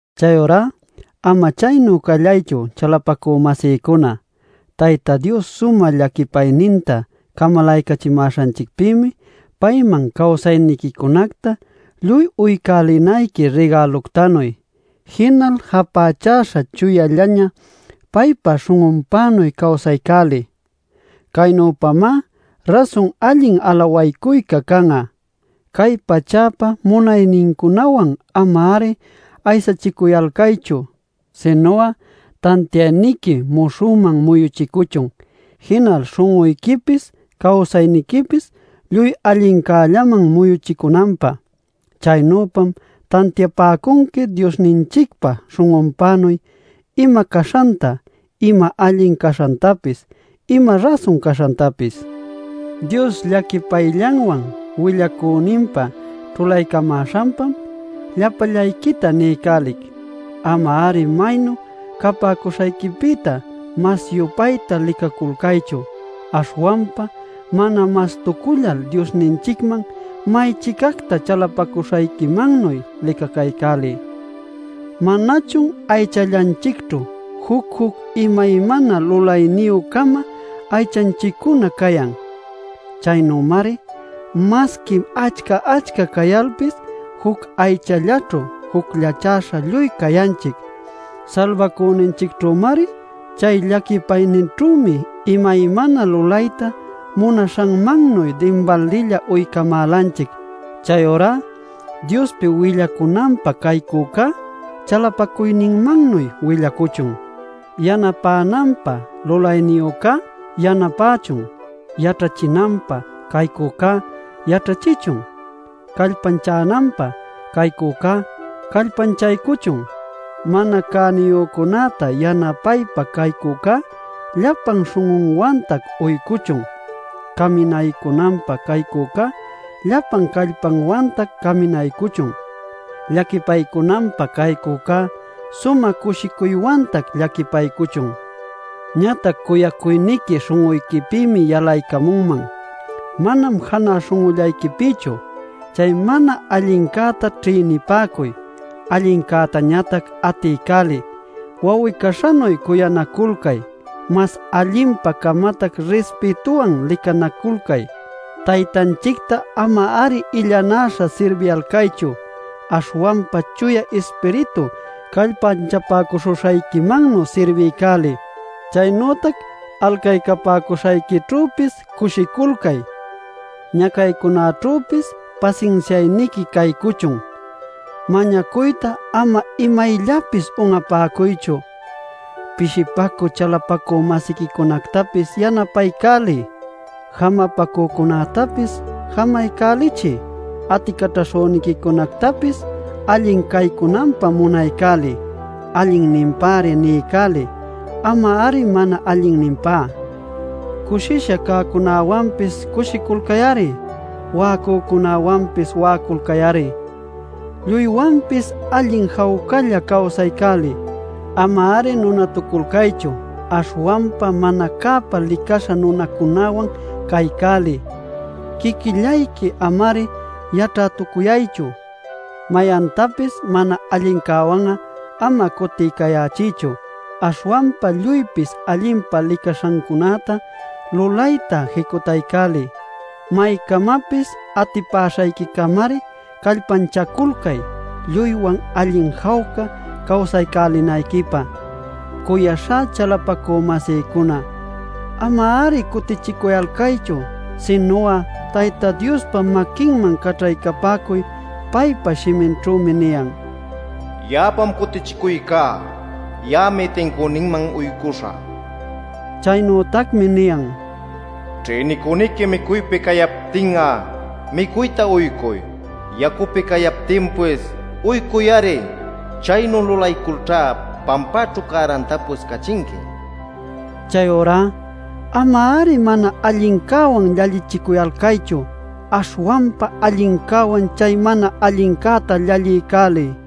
Chayurá ama chaynu callaychu, chalapacü-masïcuna: Tayta Dios sumä llaquipayninta camalaycachimäśhanchicpïmi payman cawsayniquicunacta lluy uycälinayqui rigäluctanuy. Jinal japächäśha chuyallaña paypa śhun'unpänuy cawsaycäliy. Caynüpamá rasun allin alawaycuyca can'a. Cay pachäpa munaynincunawan ama-ari aysachicuyalcaychu. Sinu'a tantiayniqui muśhüman muyuchicuchun, jinal śhun'uyquipis cawsayniquipis lluy allincällaman muyuchicunanpä. Chaynüpam tantiapäcunqui Diosninchicpa śhun'unpänuy ima caśhanta, ima allin caśhantapis, ima rasun caśhantapis. Dios llaquipayllanwan willacüninpa ćhulaycamäśhanpam llapallayquita niycälic: Ama-ari maynu capäcuśhayquipïta mas-yupaytá licaculcaychu. Aśhwanpa mana mastucullal Diosninchicman may-chicacta chalapacuśhayquimannuy licacaycäliy. ¿Manachun aychallanchicćhu juc-juc imaymana lulayniyü-cama aychanchiccuna cayan? Chaynümari masqui achca-achca cayalpis juc aychallaćhu jucllachäśha lluy cayanchic; Salbacüninchicćhümari. Chay llaquipayninćhümi imaymana lulayta munaśhanmannuy dinbaldilla uycamälanchic. Chayurá Diospi willacunanpä caycücá, chalapacuyninmannuy willacuchun. Yanapänanpä lulayniyücá yanapächun. Yaćhachinanpä caycücá yaćhachichun. Callpanchananpä caycücá callpanchaycuchun. Mana cäniyücunäta yanapaypä caycücá llapan śhun'unwantac uycuchun. Caminaycunanpä caycücá llapan callpanwantac caminaycuchun. Llaquipaycunanpä caycücá sumä cushicuywantac llaquipaycuchun. Ñatac cuyacuyniqui śhun'uyquipïmi yalaycamunman, manam janä śhun'ullayquipïchu. Chay mana allincäta ćhïnipäcuy; allincätañatac atiycäliy. Wawi-caśhanuy cuyanaculcay, mas allinpa-camatac rispïtuwan licanaculcay. Taytanchicta ama-ari illanäśha sirbiyalcaychu. Aśhwanpa Chuya Ispiritu callpanchapäcuśhuśhayquimannuy sirbiycäliy. Chaynütac alcaycapäcuśhayquićhüpis cushiculcay; ñacaycunaćhüpis pasinsiayniqui caycuchun; mañacuyta ama imayllapis un'apäcuychu. Pishipacü chalapacü-masiquicunactapis yanapaycäliy. Jamapacücunactapis jamaycälichiy. Aticaćhaśhüniquicunactapis allin caycunanpä munaycäliy. Allinninpäri niycäliy, ama-ari mana allinninpá. Cushisha cäcunäwanpis cushiculcay-ari; wa'acücunäwanpis wa'aculcay-ari. Lluywanpis allin jawcalla cawsaycäliy. Ama-ari nunatuculcaychu, aśhwanpa mana cäpa licaśha nunacunäwan caycäliy. Quiquillayqui ama-ari yaćhätucuyaychu. Mayantapis mana allincäwan'a ama cutiycayächiychu. Aśhwanpa lluypis allinpa licaśhancunäta lulayta jicutaycäliy. Maycamapis atipäśhayquicamari callpanchaculcay lluywan allin jawca cawsaycälinayquipä. Cuyaśhá chalapacü-masïcuna, ama-ari cutichicuyalcaychu. Sinu'a Tayta Diospa maquinman caćhaycapäcuy. Paypa shiminćhümi niyan: “Ya'apam cutichicuycá; ya'ami tincüninman uycuśhä” nil. Chaynütacmi niyan: “Ćhïnicüniqui micuypi cayaptin'a micuyta uycuy. Yacupi cayaptinpis uycuy-ari. Chaynu lulayculćhá pampäćhu cärantapis cachinqui” nil. Chayurá ama-ari mana allincäwan llallichicuyalcaychu. Aśhwanpa allincäwan chay mana allincäta llalliycäliy.